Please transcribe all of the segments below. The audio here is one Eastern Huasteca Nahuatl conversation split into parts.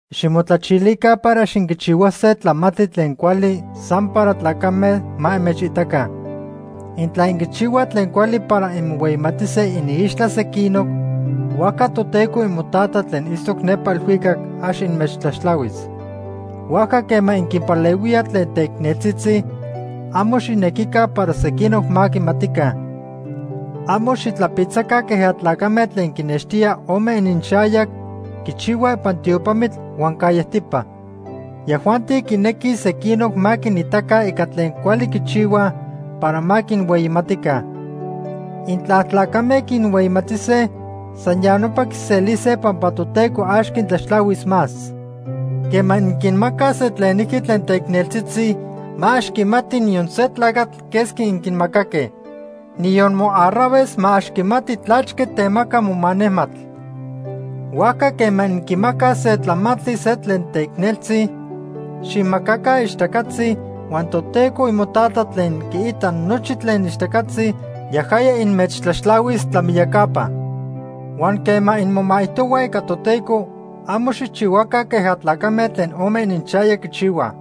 “Ximotlachilica para ax inquichihuase tlamantli tlen cuali san para tlacame ma inmechitaca. Intla inquichihuaj tlen cuali para inmohueyimatise iniixtla sequinoc, huajca Toteco imoTata tlen itztoc nepa elhuicac ax inmechtlaxtlahuis. Huajca quema inquinpalehuíaj tlen teicneltzitzi, amo xijnequica para sequinoc ma quimatica. Amo xitlapitzaca queja tlacame tlen quinextía ome ininxayac quichihuaj ipan tiopamitl huan callejtipa. Yajuanti quinequij sequinoc ma quinitaca ica tlen cuali quichihuaj para ma quinhueyimatica. Intla tlacame quinhueyimatise, san ya nopa quiselise pampa Toteco ax quintlaxtlahuis más. Quema inquinmacaj se tlenijqui tlen teicneltzitzi, ma ax quimati niyon se tlacatl quesqui inquinmacaque. Niyon moarraves ma ax quimati tlachque temaca moma nejmatl. Huajca quema inquimacaj se tlamantli se tlen teicneltzi, xijmacaca ixtacatzi, huan Toteco imoTata tlen quiita nochi tlen ixtacatzi, yajaya inmechtlaxtlahuis tlamiyacapa. “Huan quema inmomaijtohuaj ica Toteco, amo xijchihuaca queja tlacame tlen ome ininxayac quichihuaj.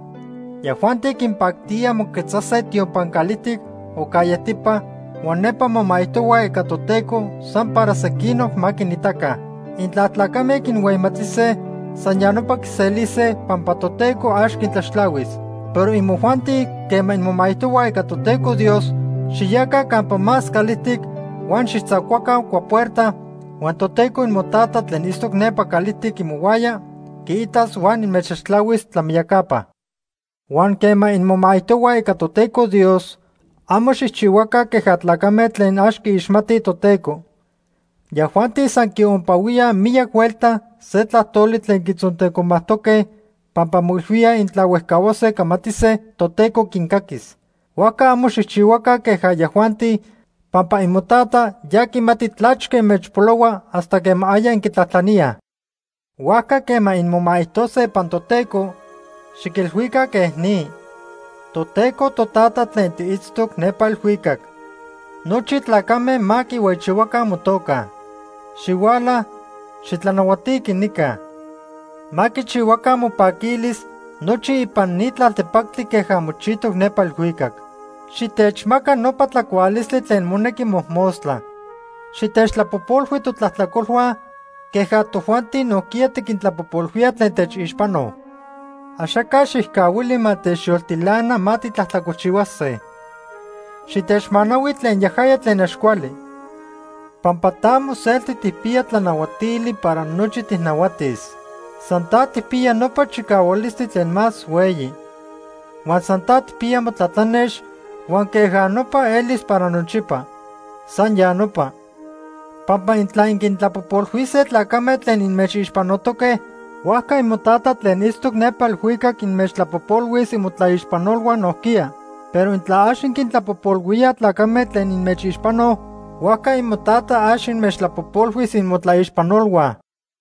Yajuanti quinpactía moquetzase tiopan calijtic o callejtipa huan nepa momaijtohuaj ica Toteco san para sequinoc ma quinitaca. Intla tlacame quinhueyimatise, san ya nopa quiselise pampa Toteco ax quintlaxtlahuis. Pero imojuanti quema inmomaijtohuaj ica Toteco Dios, xiyaca campa más calijtic huan xijtzacuaca cuapuerta huan Toteco imoTata tlen itztoc nepa calijtic imohuaya quiitas huan inmechtlaxtlahuis tlamiyacapa. “Huan quema inmomaijtohuaj ica Toteco Dios, amo xijchihuaca queja tlacame tlen ax quiixmatij Toteco. Yajuanti san quiompahuíaj miyac huelta se tlajtoli tlen quitzontecomajtoque pampa moilhuíaj intla huejcahuase camatise, Toteco quincaquis. Huajca amo xijchihuaca queja yajuanti, pampa imoTata ya quimati tlachque inmechpolohua hasta quema aya inquitlajtlaníaj. Huajca quema inmomaijtose ipan Toteco, xiquilhuica quej ni: ‘Toteco Totata tlen tiitztoc nepa elhuicac. Nochi tlacame ma quihueyichihuaca motoca. Xihuala, xitlanahuatiqui nica. Ma quichihuaca mopaquilis nochi ipan ni tlaltepactli queja mochijtoc nepa elhuicac. Xitechmaca nopa tlacualistli tlen monequi mojmostla. Xitechtlapojpolhui totlajtlacolhua, queja tojuanti nojquiya tiquintlapojpolhuíaj tlen techixpanoj. Axaca xijcahuili ma techyoltilana ma titlajtlacolchihuase. Xitechmanahui tlen yajaya tlen ax cuali. Pampa ta moselti tijpiya tlanahuatili para nochi tijnahuatis. San ta tijpiya nopa chicahualistli tlen más hueyi. Huan san ta tijpiya motlatlanex huan queja nopa elis para nochipa. San ya nopa.’ “Pampa intla inquintlapojpolhuise tlacame tlen inmechixpanotoque, huajca imoTata tlen itztoc nepa elhuicac inmechtlapojpolhuis imotlaixpanolhua nojquiya. Pero intla ax inquintlapojpolhuíaj tlacame tlen inmechixpanoj, huajca imoTata ax inmechtlapojpolhuis imotlaixpanolhua.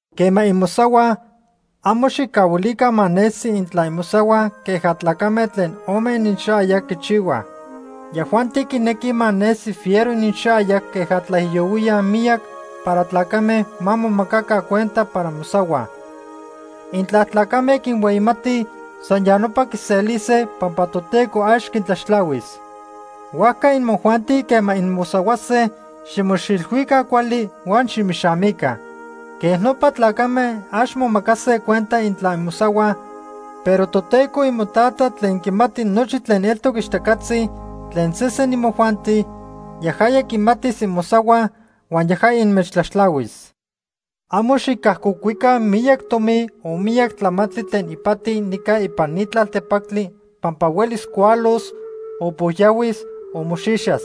“Quema inmosahuaj, amo xijcahuilica ma nesi intla inmosahuaj queja tlacame tlen ome ininxayac quichihuaj. Yajuanti quinequij ma nesi fiero ininxayac queja tlaijiyohuíaj miyac para tlacame ma momacaca cuenta para mosahuaj. Intla tlacame quinhueyimatij, san ya nopa quiselise pampa Toteco ax quintlaxtlahuis. Huajca imojuanti quema inmosahuase, ximoxilhuica cuali huan ximixamica. Quej nopa tlacame ax momacase cuenta intla inmosahuaj, pero Toteco imoTata tlen quimati nochi tlen eltoc ixtacatzi tlen sesen imojuanti, yajaya quimatis inmosahuaj huan yajaya inmechtlaxtlahuis. “Amo xicajcocuica miyac tomi o miyac tlamantli tlen ipati nica ipan ni tlaltepactli pampa huelis cualos, o pojyahuis o moxixas.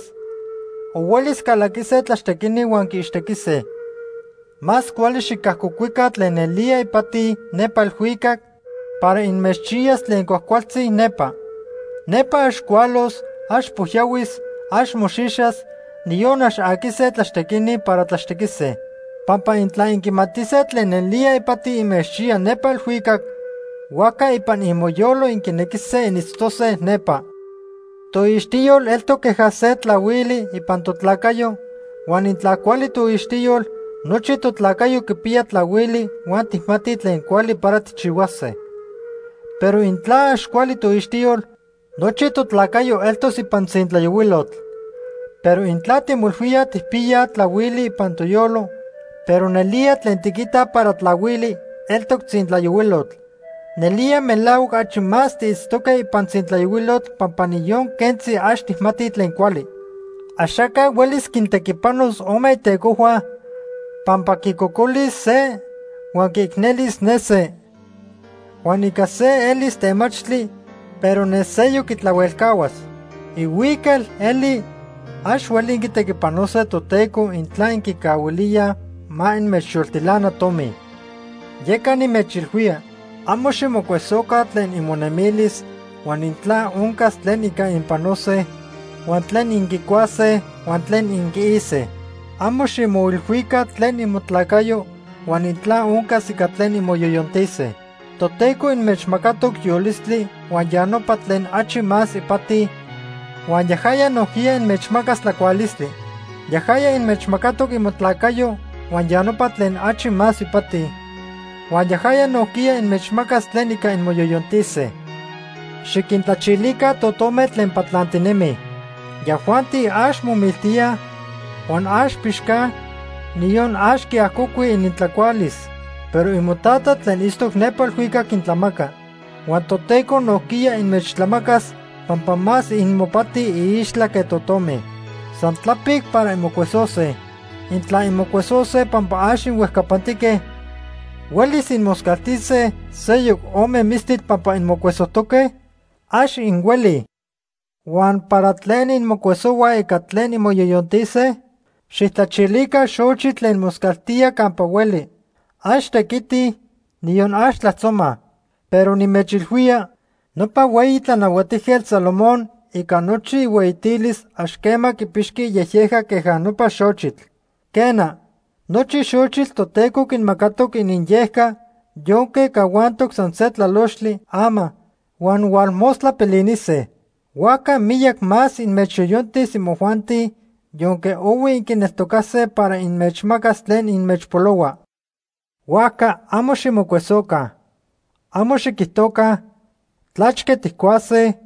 O huelis calaquise tlaxtequini huan quiixtequise. Más cuali xicajcocuica tlen nelía ipati nepa elhuicac para inmechchiyas tlen cuajcualtzi nepa. Nepa ax cualos, ax pojyahuis, ax moxixas, niyon ax aquise tlaxtequini para tlaxtequise. Pampa intla inquimatise tlen nelía ipati inmechchiya nepa elhuicac, huajca ipan imoyolo inquinequise initztose nepa. “Toixtiyol eltoc queja se tlahuili ipan totlacayo huan intla cuali toixtiyol, nochi totlacayo quipiya tlahuili huan tijmatij tlen cuali para tijchihuase. Pero intla ax cuali toixtiyol, nochi totlacayo eltos ipan tzintlayohuilotl. Pero intla timoilhuíaj tijpiyaj tlahuili ipan toyolo, pero nelía tlen tiquitaj para tlahuili, eltoc tzintlayohuilotl; nelía melahuac achi más tiitztoque ipan tzintlayohuilotl pampa niyon quentzi ax tijmatij tlen cuali. “Axaca huelis quintequipanos ome itecojhua, pampa quicocolis se huan quiicnelis ne se. Huan ica se elis temachtli, pero ne seyoc quitlahuelcahuas. Ihuical eli, ax hueli inquitequipanose Toteco intla inquicahuilíaj ma inmechyoltilana tomi. “Yeca nimechilhuía, amo ximocuesoca tlen imonemilis huan intla oncas tlen ica inpanose huan tlen inquicuase huan tlen inquiise. Amo ximoilhuica tlen imotlacayo huan intla oncas ica tlen inmoyoyontise. Toteco inmechmacatoc yolistli huan ya nopa tlen achi más ipati; huan yajaya nojquiya inmechmacas tlacualistli. Yajaya inmechmacatoc imotlacayo huan ya nopa tlen achi más ipati; huan yajaya nojquiya inmechmacas tlen ica inmoyoyontise. Xiquintlachilica totome tlen patlantinemij. Yajuanti ax momiltíaj, huan ax pixcaj, niyon ax quiajcocuij inintlacualis. Pero imoTata tlen itztoc nepa elhuicac quintlamaca. Huan Toteco nojquiya inmechtlamacas pampa más inmopati iixtla que totome. San tlapic para inmocuesose. Intla inmocuesose pampa ax inhuejcapantique, ¿huelis inmoscaltise seyoc ome mistitl pampa inmocuesojtoque? Ax inhuelij. “Huan ¿para tlen inmocuesohuaj ica tlen inmoyoyontise? Xijtlachilica xochitl tlen moscaltíaj campa hueli. Ax tequitij, niyon ax tlajtzomaj. Pero nimechilhuía, nopa hueyi Tlanahuatijquetl Salomón ica nochi ihueyitilis ax quema quipixqui iyejyejca queja nopa xochitl. Quena, nochi xochitl Toteco quinmacatoc ininyejca yonque cahuantoque san se tlalochtli ama huan hualmostla pilinise. Huajca miyac más inmechyoyontis imojuanti, yonque ohui inquineltocase para inmechmacas tlen inmechpolohua. Huajca amo ximocuesoca. Amo xiquijtoca: ‘¿Tlachque tijcuase?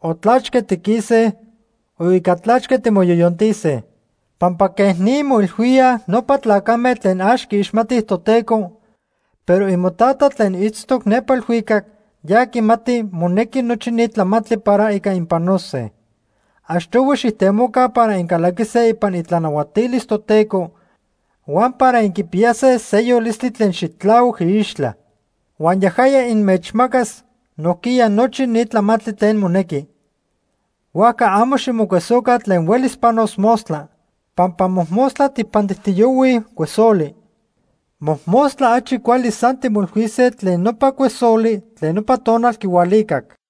o ¿tlachque tiquise? o ¿ica tlachque timoyoyontise?’ Pampa quej ni moilhuíaj nopa tlacame tlen ax quiixmatij Toteco, pero imoTata tlen itztoc nepa elhuicac, ya quimati monequi nochi ni tlamantli para ica inpanose. Achtohui xijtemoca para incalaquise ipan itlanahuatilis Toteco huan para inquipiyase se yolistli tlen xitlahuac iixtla. Huan yajaya inmechmacas nojquiya nochi ni tlamantli tlen monequi. Huajca amo ximocuesoca tlen huelis panos mostla. Pampa mojmostla tijpantijtiyohuij cuesoli. Mojmostla achi cuali san timoilhuise tlen nopa cuesoli tlen nopa tonal quihualicac.